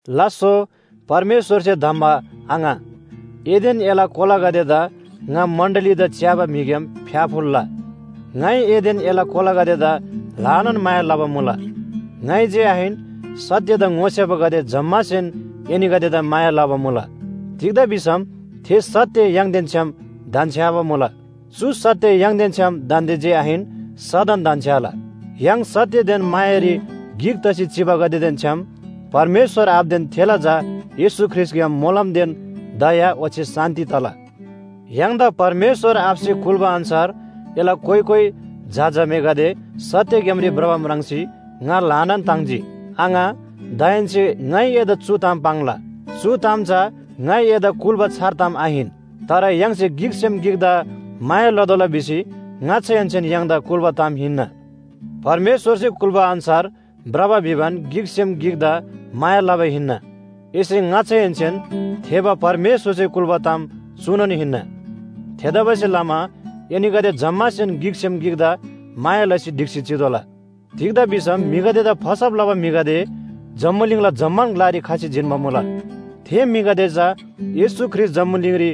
लास्‍सो परमेश्‍वरसे धम्‍बा आङा, एदेन एला कोलागदेदा ङा मण्‍डलीदा च्‍याबा म्‍हिग्‍याम फ्‍याफुल्‍ला! ङाइ एदेन एला कोलागदेदा ल्‍हानान माया लबा मुला। ङाइ जे आहिन, सत्‍यदा ङोसेबागदे जम्‍मासेन एनीगदेदा माया लबा मुला। तिग्‍दा भिसम थे सत्‍य य्‍हाङदेन छ्‌याम धन्‍छ्‌याबा मुला। चु सत्‍य य्‍हाङदेन छ्‌याम दान्‍दे जे आहिन सदन धन्‍छ्‌याला। य्‍हाङ सत्‍यदेन मायारी गिक तसी चिबागदेदेन छ्‌याम परमेश्‍वर आबादेन थेला झा येशू ख्रीष्‍टग्‍याम मोलमदेन दया ओच्‍छे शान्‍ति तला। य्‍हाङदा परमेश्‍वर आबासे कुल्‍बा अन्‍छार एला कोइ कोइ झा झामेगदे सत्‍य ग्‍यामरी भ्रबा म्राङ्सी ङा ल्‍हानान ताङ्जी। आङा, दाहेन्‍से ङाइ एदा चु ताम पाङ्ला, चु ताम चा ङाइ एदा कुल्‍बा छार ताम आहिन। तर य्‍हाङसे गिकसेम गिकदा माया लतोःला भिसी ङाच्‍छाहेन्‍सेन य्‍हाङदा कुल्‍बा ताम हिन्‍ना। परमेश्‍वरसे कुल्‍बा अन्‍छार भ्रबा भिबान गिकसेम गिकदा माया लबा हिन्‍ना। एसे ङाच्‍छाहेन्‍सेन थेःबा परमेश्‍वरसे कुल्‍बा ताम चुनोन हिन्‍ना। थेतबासेलमा एनीगदे जम्‍मासेन गिकसेम गिकदा माया लसी ढिक्‍सी चितोःला। तिग्‍दा भिसम म्‍हिगदेदा फसब लबा म्‍हिगदे जम्‍बुलिङला जम्‍मान ग्‍लारी खसी जिन्‍बा मुला। थे म्‍हिगदे चा येशू ख्रीष्‍ट जम्‍बुलिङरी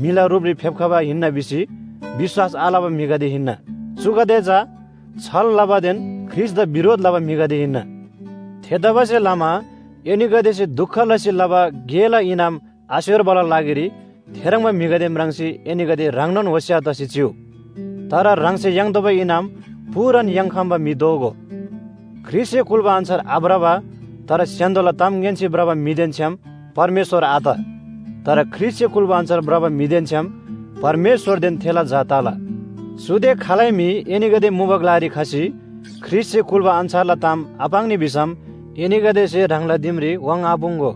म्‍हिला रुपरी फेप्‍खबा हिन्‍ना भिसी विश्‍वास आलबा म्‍हिगदे हिन्‍ना। चुगदे चा छल लबादेन ख्रीष्‍टदा बिरोध लबा म्‍हिगदे हिन्‍ना। थेतबासेलमा एनीगदेसे दुख लसी लबा गेला इनाम आस्‍योर्बाला लागिरी थेह्रङ्बा म्‍हिगदे म्राङ्सी एनीगदे ह्राङनोन होशियार तसी चिउ। तर ह्राङसे याङ्तोःबा इनाम पूरान याङ्‌खम्‍बा म्‍हि दोगो। ख्रीष्‍टसे कुल्‍बा अन्‍छार आभ्रबा, तर स्‍य्‍हान्‍दोला ताम ङ्‌यान्‍सी भ्रबा म्‍हिदेन छ्‌याम परमेश्‍वर आत। तर ख्रीष्‍टसे कुल्‍बा अन्‍छार भ्रबा म्‍हिदेन छ्‌याम परमेश्‍वरदेन थेला झा तला। चुदे खालै म्‍हि एनीगदे मुबा ग्‍लारी खसी ख्रीष्‍टसे कुल्‍बा अन्‍छारला ताम आपाङ्नी भिसम एनीगदेसे ह्राङला दिमरी वाङ्थापुङ्‍गो।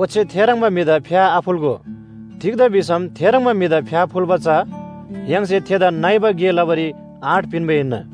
ओच्‍छे थेह्रङ्बा म्‍हिदा फ्‍याथाफुल्‍गो। तिग्‍दा भिसम थेह्रङ्बा म्‍हिदा फ्‍याफुल्‍बा चा य्‍हाङसे थेदा नइबा गे लबारी आँट पिन्‍बा हिन्‍ना।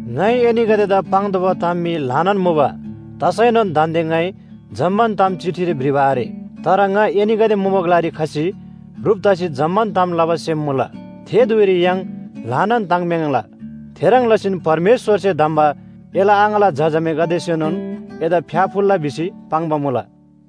ङाइ एनीगदेदा पाङ्तोःबा ताम मी ल्‍हानान मुबा। तसैनोन दान्‍दे ङाइ जम्‍मान ताम चिठीरी भ्रिबा आरे। तर ङा एनीगदे मुबा ग्‍लारी खसी ह्रुप तसी जम्‍मान ताम लबा सेम मुला, थे धुइरी य्‍हाङ ल्‍हानान ताङ्म्‍याङ्ला। थेह्रङ् लसीन परमेश्‍वरसे धम्‍बा एला आङाला झा झामेगदेसेनोन एदा फ्‍याफुल्‍ला भिसी पाङ्बा मुला।